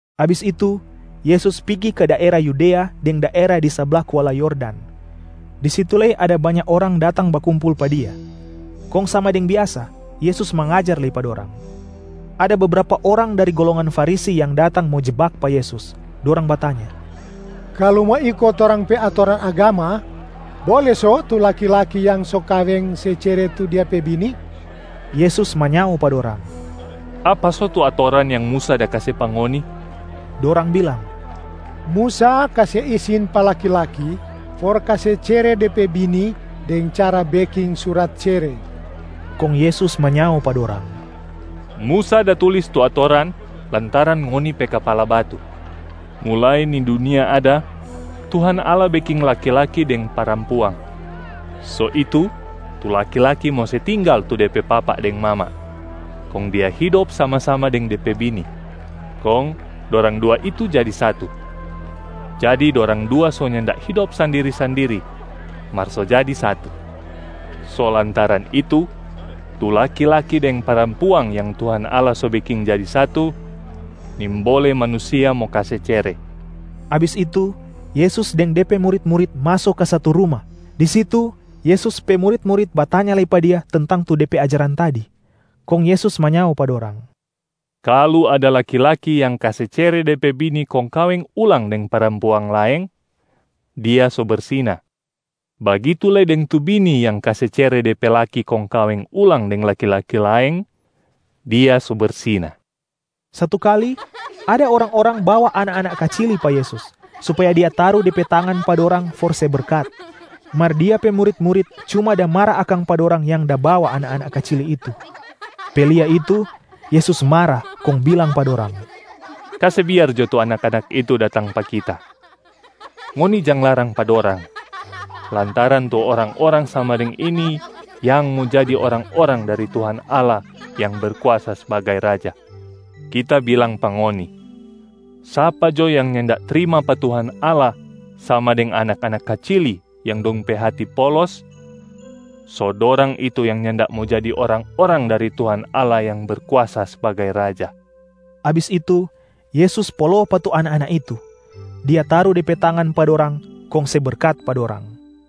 Abis itu, Yesus pigi ka daera Yudea deng daera di sabla kuala Yordan. Di situ lei ada banya orang datang bakumpul pa Dia. Kong sama deng biasa, Yesus mangajar lei pa dorang. Ada bebrapa orang dari golongan Farisi yang datang mo jebak pa Yesus, dorang batanya, “Kalu mo iko torang pe atoran agama, bole so tu laki-laki yang so kaweng se cere tu dia pe bini?” Yesus manyao pa dorang, “Apa so tu atoran yang Musa da kase pa ngoni?” Dorang bilang, “Musa kase isin pa laki-laki for kase cere de pe bini deng cara beking surat cere.” Kong Yesus manyao pa dorang, “Musa da tulis tu atoran lantaran ngoni pe kapala batu. Mulai ni dunia ada, Tuhan Allah beking laki-laki deng parampuang. So itu, tu laki-laki mo se tinggal tu de pe papa deng mama, kong dia hidop sama-sama deng de pe bini, kong dorang dua itu jadi satu. Jadi dorang dua so nyanda hidop sandiri-sandiri, mar so jadi satu. So lantaran itu, tu laki-laki deng parampuang yang Tuhan Allah so beking jadi satu, nimbole manusia mo kase cere.” Abis itu, Yesus deng De pe murit-murit maso ka satu ruma. Di situ Yesus pe murit-murit batanya lei pa Dia tentang tu De pe ajaran tadi. Kong Yesus manyao pa dorang, “Kalu ada laki-laki yang kase cere de pe bini kong kaweng ulang deng parampuang laeng, dia so bersina. Bagitu lei deng tu bini yang kase cere de pe laki kong kaweng ulang deng laki-laki laeng, dia so bersina.” Satu kali ada orang-orang bawa anak-anak kacili pa Yesus supaya Dia taru De pe tangan pa dorang for se berkat, mar Dia pe murit-murit cuma da mara akang pa dorang yang da bawa anak-anak kacili itu. Pe lia itu, Yesus mara kong bilang pa dorang, “Kase biar jo tu anak-anak itu datang pa Kita! Ngoni jang larang pa dorang lantaran tu orang-orang sama deng ini yang mo jadi orang-orang dari Tuhan Allah yang Berkuasa sbagai Raja. Kita bilang pa ngoni, sapa jo yang nyanda trima pa Tuhan Allah sama deng anak-anak kacili yang dong pe hati polos, so dorang itu yang nyanda mo jadi orang-orang dari Tuhan Allah yang Berkuasa sbagai Raja.” Abis itu, Yesus polo pa tu anak-anak itu. Dia taru De pe tangan pa dorang kong se berkat pa dorang.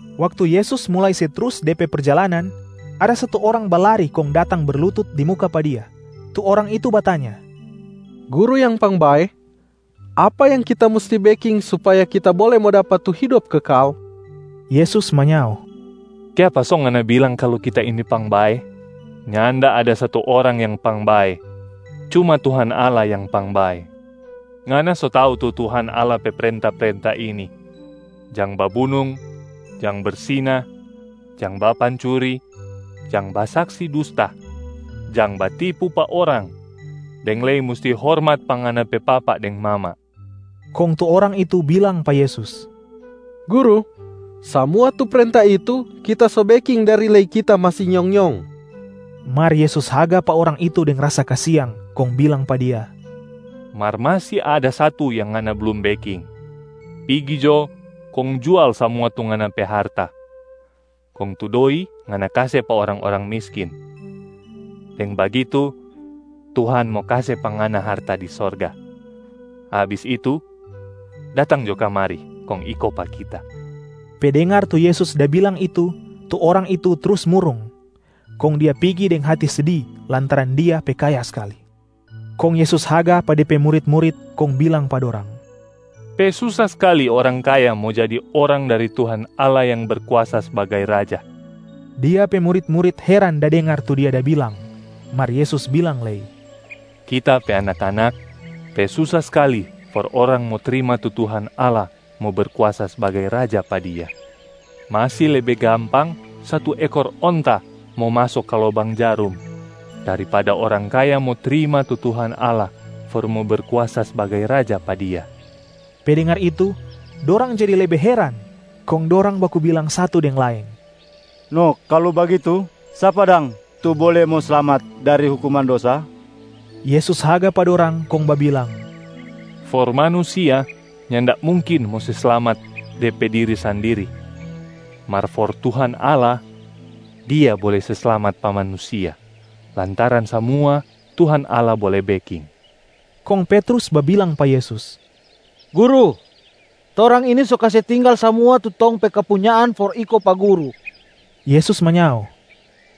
Waktu Yesus mulai se trus De pe perjalanan, ada satu orang balari kong datang berlutut di muka pa Dia. Tu orang itu batanya, “Guru yang pangbae, apa yang kita musti beking supaya kita bole mo dapa tu hidop kekal?” Yesus manyao, “Kiapa so ngana bilang kalu Kita ini pangbae? Nyanda ada satu orang yang pangbae, cuma Tuhan Allah yang pangbae. Ngana so tau tu Tuhan Allah pe prenta-prenta ini: jang babunung, jang bersina, jang bapancuri, jang basaksi dusta, jang batipu pa orang, deng lei musti hormat pa ngana pe papa deng mama!” Kong tu orang itu bilang pa Yesus, “Guru, samua tu prenta itu kita so beking dari lei kita masi nyong-nyong.” Mar Yesus haga pa orang itu deng rasa kasiang kong bilang pa dia, “Mar masi ada satu yang ngana blum beking. Pigi jo kong jual samua tu ngana pe harta, kong tu doi ngana kase pa orang-orang miskin, deng bagitu Tuhan mo kase pa ngana harta di sorga. Abis itu, datang jo kamari kong iko pa Kita.” Pe dengar tu Yesus da bilang itu tu orang itu trus murung, kong dia pigi deng hati sedi lantaran dia pe kaya skali. Kong Yesus haga pa De pe murit-murit kong bilang pa dorang, “Pe susa skali orang kaya mo jadi orang dari Tuhan Allah yang Berkuasa sbagai Raja.” Dia pe murit-murit heran da dengar tu Dia da bilang. Mar Yesus bilang lei, “Kita pe anak-anak, pe susa skali for orang mo trima tu Tuhan Allah mo Berkuasa sbagai Raja pa dia. Masi lebe gampang satu ekor onta mo maso ka lobang jarum, daripada orang kaya mo trima tu Tuhan Allah for mo Berkuasa sbagai Raja pa dia.” Pe dengar itu, dorang jadi lebe heran kong dorang baku bilang satu deng laeng, “No kalu bagitu, sapa dang tu bole mo slamat dari hukuman dosa?” Yesus haga pa dorang kong babilang, “For manusia nyanda mungkin mo se slamat de pe diri sandiri, mar for Tuhan Allah, Dia bole se slamat pa manusia lantaran samua Tuhan Allah bole beking.” Kong Petrus babilang pa Yesus, “Guru, torang ini so kase tinggal samua tu tong pe kepunyaan for iko pa Guru.” Yesus manyao,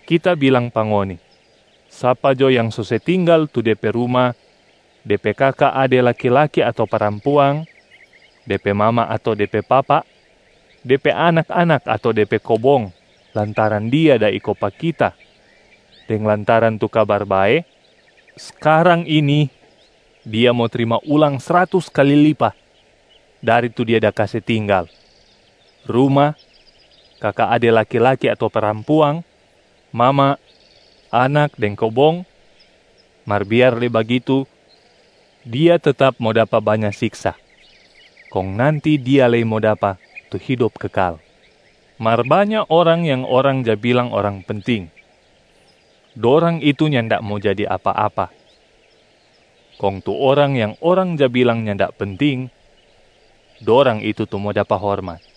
“Kita bilang pa ngoni, sapa jo yang so se tinggal tu de pe ruma, de pe kaka ade laki-laki ato parampuang, de pe mama ato de pe papa, de pe anak-anak ato de pe kobong lantaran dia da iko pa Kita deng lantaran tu Kabar Bae, skarang ini dia mo trima ulang sratus kali lipa dari tu dia da kase tinggal: ruma, kaka ade laki-laki ato parampuang, mama, anak deng kobong, mar biar lei bagitu dia tetap mo dapa banya siksa, kong nanti dia lei mo dapa tu hidop kekal. Mar banya orang yang orang ja bilang orang penting, dorang itu nyanda mo jadi apa-apa, kong tu orang yang orang ja bilang nyanda penting, dorang itu tu mo dapa hormat.”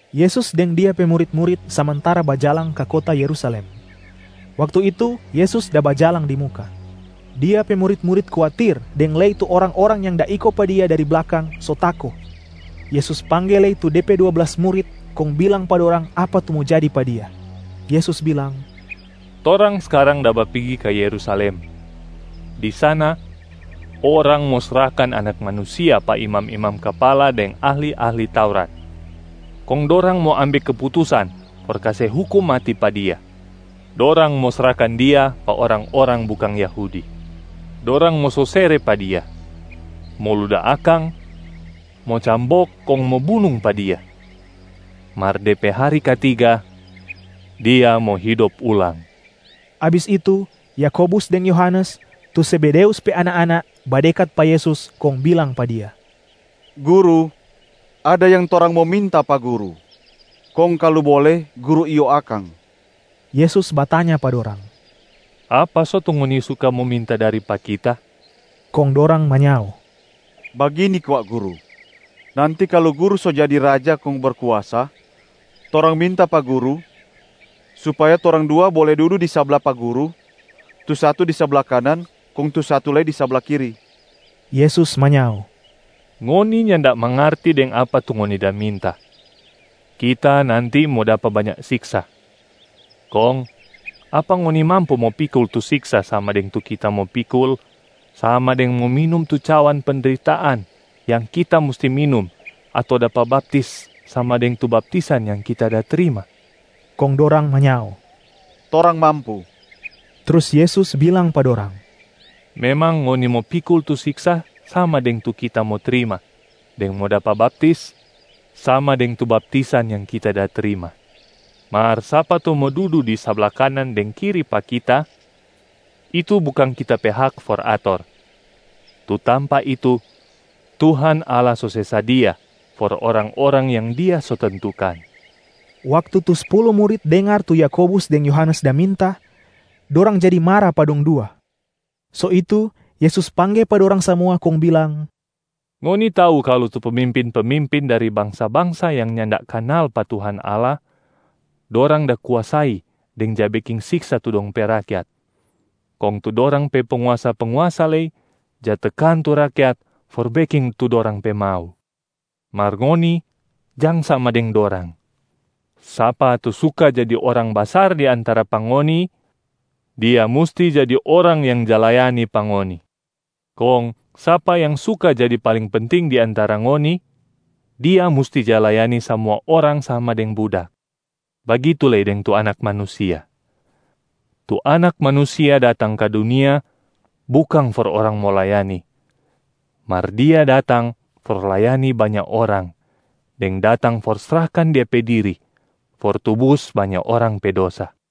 Yesus deng Dia pe murit-murit samantara bajalang ka kota Yerusalem. Waktu itu Yesus da bajalang di muka. Dia pe murit-murit kuatir deng lei tu orang-orang yang da iko pa Dia dari blakang so tako. Yesus pangge lei tu De pe dua blas murit kong bilang pa dorang apa tu mo jadi pa Dia. Yesus bilang, “Torang skarang da bapigi ka Yerusalem. Di sana, orang mo srahkan Anak Manusia pa imam-imam kapala deng ahli-ahli Taurat, kong dorang mo ambe keputusan for kase hukum mati pa Dia. Dorang mo srahkan Dia pa orang-orang bukang Yahudi. Dorang mo sosere pa Dia, mo luda akang, mo cambok kong mo bunung pa Dia. Mar de pe hari katiga, Dia mo hidop ulang.” Abis itu Yakobus deng Yohanes, tu Zebedeus pe anak-anak, badekat pa Yesus kong bilang pa Dia, “Guru, ada yang torang mo minta pa Guru, kong kalu bole, Guru iyo akang.” Yesus batanya pa dorang, “Apa so tu ngoni suka mo minta dari pa Kita?” Kong dorang manyao, “Bagini kwa, Guru. Nanti kalu Guru so jadi Raja kong berkuasa, torang minta pa Guru supaya torang dua bole dudu di sabla pa Guru, tu satu di sabla kanan kong tu satu lei di sabla kiri.” Yesus manyao, “Ngoni nyanda mangarti deng apa tu ngoni da minta. Kita nanti mo dapa banya siksa, kong apa ngoni mampu mo pikul tu siksa sama deng tu Kita mo pikul, sama deng mo minum tu cawan pendritaan yang Kita musti minum ato dapa baptis sama deng tu baptisan yang Kita da trima?” Kong dorang manyao, “Torang mampu.” Trus Yesus bilang pa dorang, “Memang ngoni mo pikul tu siksa sama deng tu Kita mo trima deng mo dapa baptis sama deng tu baptisan yang kita da trima. Mar sapa tu mo dudu di sabla kanan deng kiri pa Kita, itu bukang Kita pe hak for ator. Tu tampa itu Tuhan Allah so se sadia for orang-orang yang Dia so tentukan.” Waktu tu spulu murit dengar tu Yakobus deng Yohanes da minta, dorang jadi mara pa dong dua. So itu, Yesus pangge pa dorang samua kong bilang, “Ngoni tau kalu tu pemimpin-pemimpin dari bangsa-bangsa yang nyanda kanal pa Tuhan Allah, dorang da kuasai deng ja beking siksa tu dong pe rakyat. Kong tu dorang pe penguasa-penguasa lei ja tekan tu rakyat for beking tu dorang pe mau. Mar ngoni jang sama deng dorang! Sapa tu suka jadi orang basar di antara pa ngoni, dia musti jadi orang yang ja layani pa ngoni. Kong sapa yang suka jadi paling penting di antara ngoni, dia musti ja layani samua orang sama deng budak. Bagitu lei deng tu Anak Manusia. Tu Anak Manusia datang ka dunia bukang for orang mo layani, mar Dia datang for layani banya orang deng datang for srahkan Dia pe diri for tubus banya orang pe dosa.”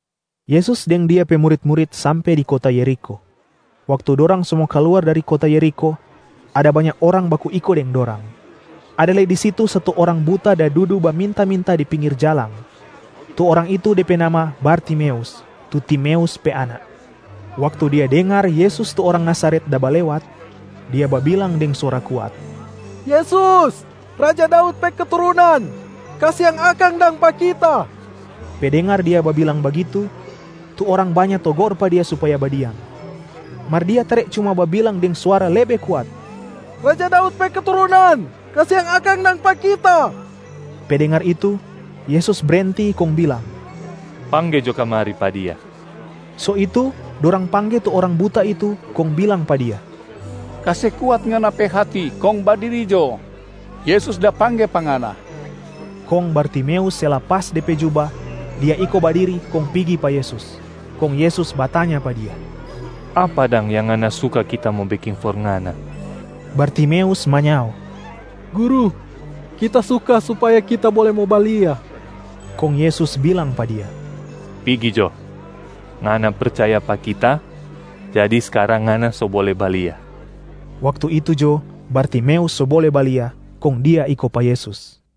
Yesus deng Dia pe murit-murit sampe di kota Yerikho. Waktu dorang so mo kaluar dari kota Yerikho, ada banya orang baku iko deng dorang. Ada lei di situ satu orang buta da dudu baminta-minta di pinggir jalang. Tu orang itu de pe nama Bartimeus, tu Timeus pe anak. Waktu dia dengar Yesus tu orang Nazaret da balewat, dia babilang deng suara kuat, “Yesus, raja Daud pe keturunan, kasiang akang dang pa kita!” Pe dengar dia babilang bagitu, tu orang banya togor pa dia supaya badiam. Mar dia tare cuma babilang deng suara lebe kuat, “Raja Daud pe keturunan, kasiang akang dang pa kita!” Pe dengar itu, Yesus brenti kong bilang, “Pangge jo kamari pa dia!” So itu dorang pangge tu orang buta itu kong bilang pa dia, “Kase kuat ngana pe hati kong badiri jo, Yesus da pangge pa ngana.” Kong Bartimeus se lapas de pe juba, dia iko badiri kong pigi pa Yesus. Kong Yesus batanya pa dia, “Apa dang yang ngana suka Kita mo beking for ngana?” Bartimeus manyao, “Guru, kita suka supaya kita bole mo balia.” Kong Yesus bilang pa dia, “Pigi jo, ngana percaya pa Kita jadi skarang ngana so bole balia.” Waktu itu jo, Bartimeus so bole balia, kong dia iko pa Yesus.